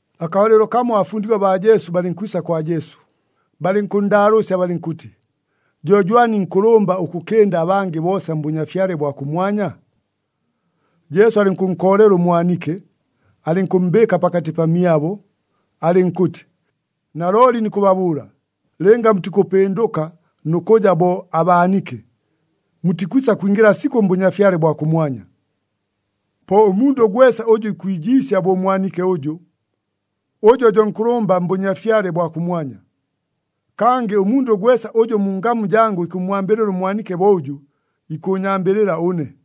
Akabalɨlo kamo abafundigwa baa Jesu balɨnkwisa kwa Jesu, balɨnkʉnndaalʉʉsya balɨnkʉtɨ, “Jo jwani nkʉlʉmba ʉkʉkɨnda abangɨ boosa mBʉnyafyale bwa kʉmwanya?” Jesu alɨnkʉnkoolela ʉmwanike, alɨnkʉmmbɨɨka pakatɨ pamyabo, alɨnkʉtɨ, “Nalooli nikʉbabʉʉla, lɨnga mutikʉpɨndʉka nʉ kʉja bo abaanike, mutikwisa kwingɨla sikʉ mBʉnyafyale bwa kʉmwanya. Po ʉmundʉ gwesa ʉjʉ ikwijiisya bo ʉmwanike ʉjʉ, ʉjo jo nkʉlʉmba mBʉnyafyale bwa kʉmwanya. Kangɨ ʉmundʉ gwesa ʉjʉ mu ngamu jangʉ ikʉmmwambɨlɨla ʉmwanike bo ʉjʉ, ikʉʉnyambɨlɨla ʉne.”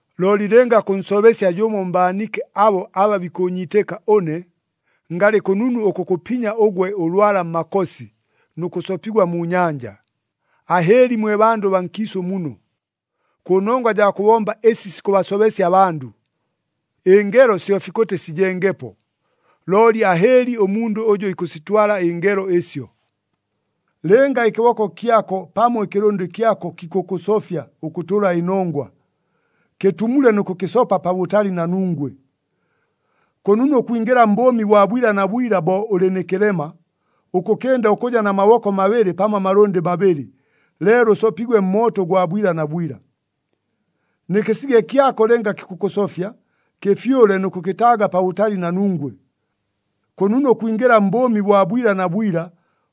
“Looli lɨnga kʉnsobesya jʉmo mbaanike abo aba bikʉʉnyiitɨka ʉne, ngalɨ kʉnunu ʉkʉkʉpinya ʉgwe ʉlwala mmakosi nʉ kʉsopigwa mu nyanja. Ahɨɨli mwe bandʉ baa nkiisʉ muno, kʉnongwa jaa kʉbomba ɨsi sikʉbasobesya abandʉ! Ɨngelo syo fikʉtɨ sijengepo, looli ahɨɨli ʉmundʉ ʉjʉ ikʉsitwala ɨngelo ɨsyo! Lɨnga ɨkɨboko kyako pamo ɨkɨlʉndɨ kyako kikʉkʉsofya ʉkʉtʉla ɨnongwa, kɨtumule nʉ kʉkɨsopa pabʉtali na nungwe! Kʉnunu ʉkwingɨla mbʉʉmi bwa bwila na bwila, bo ʉlɨ nɨ kɨlema, ʉkʉkɨnda ʉkʉja na maboko mabɨlɨ pamo amalʉndɨ mabɨlɨ, leelo ʉsopigwe mmooto ʉgwa bwila na bwila. Nɨ kɨsige kyako lɨnga kikʉkʉsofya, kɨfyʉle nʉ kʉkɨtaaga pabʉtali na nungwe! Kʉnunu ʉkwingɨla mbʉʉmi bwa bwila na bwila,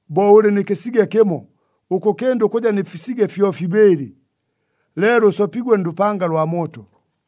bo ʉlɨ nɨ kɨsige kɨmo, ʉkʉkɨnda ʉkʉja nɨ fisige fyofibɨɨlɨ, leelo ʉsopigwe ndʉpanga lwa mooto.”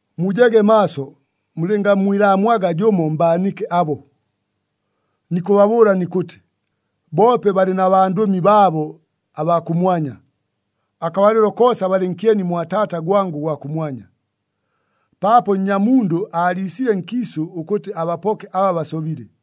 “Mujege maaso, mulɨngammwilaamwaga jʉmo mbaanike abo! Nikʉbabʉʉla nikʉtɨ, boope balɨ na bandʉmi baabo abaa kʉmwanya, akabalɨlo koosa balɨ nkyeni mwa Taata gwangʉ ʉgwa kʉmwanya. [ Paapo Nnyamundʉ aaliisile nkiisʉ ʉkʉtɨ abapoke aba basobile.]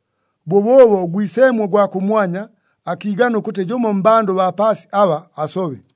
Bʉbʉʉbo ʉGwiseemwe ʉgwa kʉmwanya akiigana ʉkʉtɨ jʉmo mmbandʉ baa paasi aba asobe.”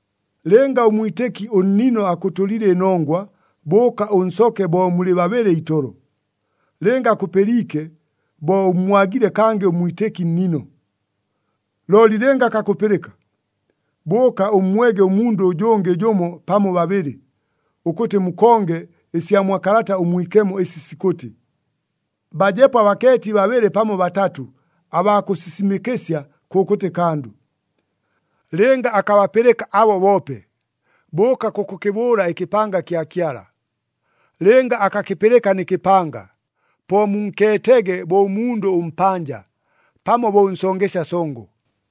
“Lɨnga ʉmwitɨki ʉnnino akʉtʉliile ɨnongwa, bʉʉka ʉnsoke bo mulɨ babɨlɨ itolo. Lɨnga akʉpɨliike, bo ʉmmwagile kangɨ ʉmwitɨki nnino. Looli lɨnga akakʉpɨlɨka, bʉʉka ʉmmwege ʉmundʉ ʉjʉngɨ jʉmo pamo babɨlɨ, ʉkʉtɨ mukonge ɨsya mwa Kalata ʉMwikemo ɨsi sikʉtɨ, ‘Bajepo abakeeti babɨlɨ pamo batatʉ abaa kʉsisimɨkɨsya kʉkʉtɨ kandʉ.’ Lɨnga akabapɨlɨka abo boope, bʉʉka kʉkʉkɨbʉʉla ɨkɨpanga kya Kyala. Lɨnga akakɨpɨlɨka nɨ kɨpanga, po munkeetege bo ʉmundʉ ʉmpanja, pamo bo ʉnsongesya songo.”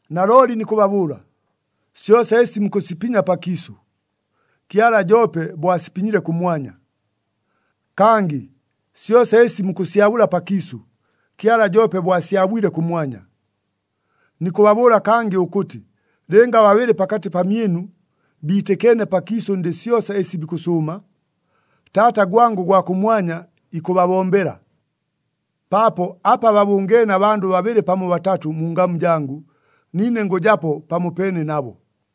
“Nalooli nikʉbabʉʉla, syosa ɨsi mukʉsipinya pakiisʉ, Kyala joope bo asipinyile kʉmwanya. Kangɨ syosa ɨsi mukʉsyabʉla pakiisʉ, Kyala joope bo asyabwile kʉmwanya. Nikʉbabʉʉla kangɨ ʉkʉtɨ, lɨnga babɨlɨ pakatɨ pamyɨnu biitɨkeene pakiisʉ ndɨ syosa ɨsi bikʉsʉʉma, Taata gwangʉ ʉgwa kʉmwanya ikʉbabombela. Paapo apa babʉngeene abandʉ babɨlɨ pamo batatʉ mu ngamu jangʉ, niine ngʉjapo pamopeene nabo.”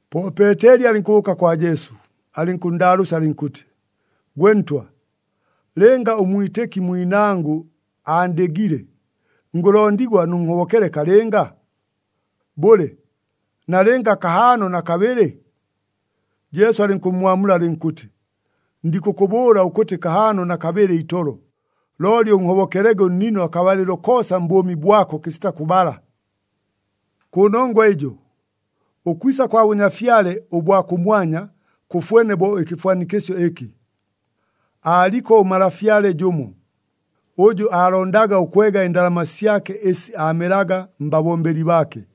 Po Peeteli alɨnkʉbʉʉka kwa Jesu, alɨnkʉnndaalʉʉsya alɨnkʉtɨ, “Gwe Ntwa, lɨnga ʉmwitɨki mwinangʉ aandɨgile, ngʉlondigwa nʉnhobokele kalɨnga? Bʉle, nalɨnga kahaano na kabɨlɨ?” Jesu alɨnkʉmmwamula alɨnkʉtɨ, “Ndikʉkʉbʉʉla ʉkʉtɨ kahaano na kabɨlɨ itolo, looli ʉnhobokelege ʉnnino akabalɨlo koosa mbʉʉmi bwako kɨsita kʉbala. “Kʉnongwa ɨjo, ʉkwisa kwa Bʉnyafyale bwa kʉmwanya kʉfwene bo ɨkɨfwanikɨsyo ɨkɨ. Aaliko ʉmalafyale jʉmo, ʉjʉ aalondaga ʉkwega ɨndalama syake ɨsi aamelaga mbabombeli baake.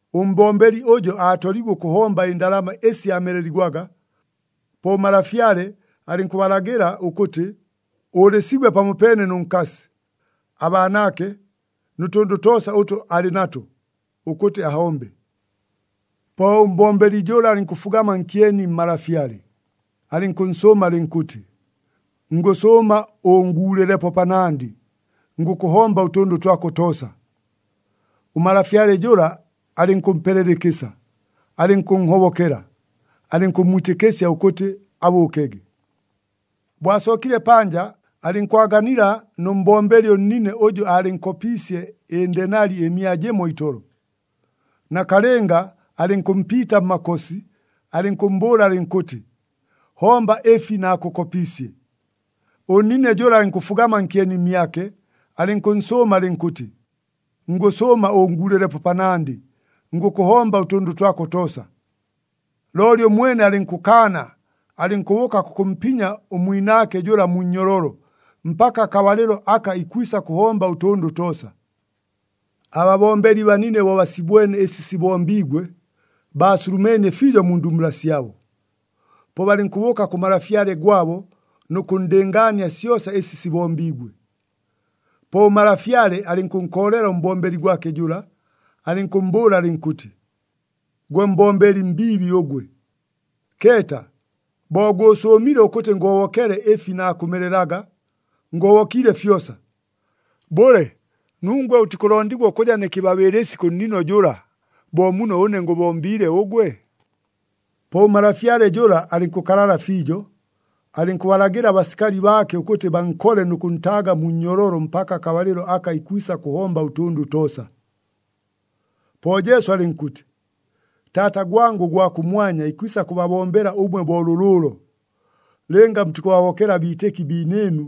Ʉmbombeli ʉjo aatoliigwe ʉkʉhomba ɨndalama ɨsi aameleligwaga. Po ʉmalafyale alɨnkʉbalagɨla ʉkʉtɨ ʉʉlɨsigwe pamopeene nʉ nkasi, abaanaake, nʉ tʉndʉ toosa ʉtʉ alɨ nato, ʉkʉtɨ ahombe. “Po ʉmbombeli jʉla alɨnkʉfugama nkyeni mmalafyale, alɨnkʉnsʉʉma alɨnkʉtɨ, ‘Ngʉsʉʉma ʉʉnguulɨlepo panandɨ, ngʉkʉhomba ʉtʉndʉ twako toosa.’ Ʉmalafyale jʉla alɨnkʉmpelela ɨkɨsa, alɨnkʉnhobokela, alɨnkʉmmwitɨkɨsya ʉkʉtɨ abʉʉkege. “Bo asookile panja, alɨnkwaganila nʉ mbombeli ʉnnine ʉjʉ aalɨnkopiisye ɨndenali ɨmia jɨmo itolo. Nakalɨnga alɨnkʉmpiita mmakosi, alɨnkʉmmbʉʉla alɨnkʉtɨ, ‘Homba ɨfi naakʉkopiisye.’ Ʉnnine jʉla alɨnkʉfugama nkyeni mmyake, alɨnkʉnsʉʉma alɨnkʉtɨ, ‘Ngʉsʉʉma ʉʉnguulɨlepo panandɨ, ngʉkʉhomba ʉtʉndʉ twako toosa.’ Looli ʉmwene alɨnkʉkaana, alɨnkʉbʉʉka kʉkʉmpinya ʉmwinaake jʉla mu nnyololo, mpaka akabalɨlo aka ikwisa kʉhomba ʉtʉndʉ toosa. “Ababombeli banine bo basibwene ɨsi sibombiigwe, baasulumeenie fiijo mu ndumbula syabo. Po balɨnkʉbʉʉka kʉ malafyale gwabo nʉ kʉnndɨngaania syosa ɨsi sibombiigwe. Po ʉmalafyale alɨnkʉnkoolela ʉmbombeli gwake jʉla, alɨnkʉmmbʉʉla alɨnkʉtɨ, ‘Gwe mbombeli mbiibi ʉgwe! Keeta! Bo gʉʉsʉʉmile ʉkʉtɨ ngʉhobokele ɨfi naakʉmelelaga, ngʉhobokiile fyosa! Bʉle, nungwe ʉtikʉlondigwa ʉkʉja nɨ kɨbabɨɨlɨsi kʉ nnino jʉla, bo muno ʉne ngʉbombiile ʉgwe?’ “Po ʉmalafyale jʉla alɨnkʉkalala fiijo, alɨnkʉbalagɨla abasikali baake ʉkʉtɨ bankole nʉ kʉntaaga mu nnyololo mpaka akabalɨlo aka ikwisa kʉhomba ʉtʉndʉ toosa.” Po Jesu alɨnkʉtɨ, “Taata gwangʉ ʉgwa kʉmwanya ikwisa kʉbabombela ʉmwe bo lʉlʉʉlo, lɨnga mutikʉbahobokela abiitɨki biinɨɨnu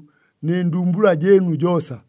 nɨ ndumbula jɨɨnu joosa.”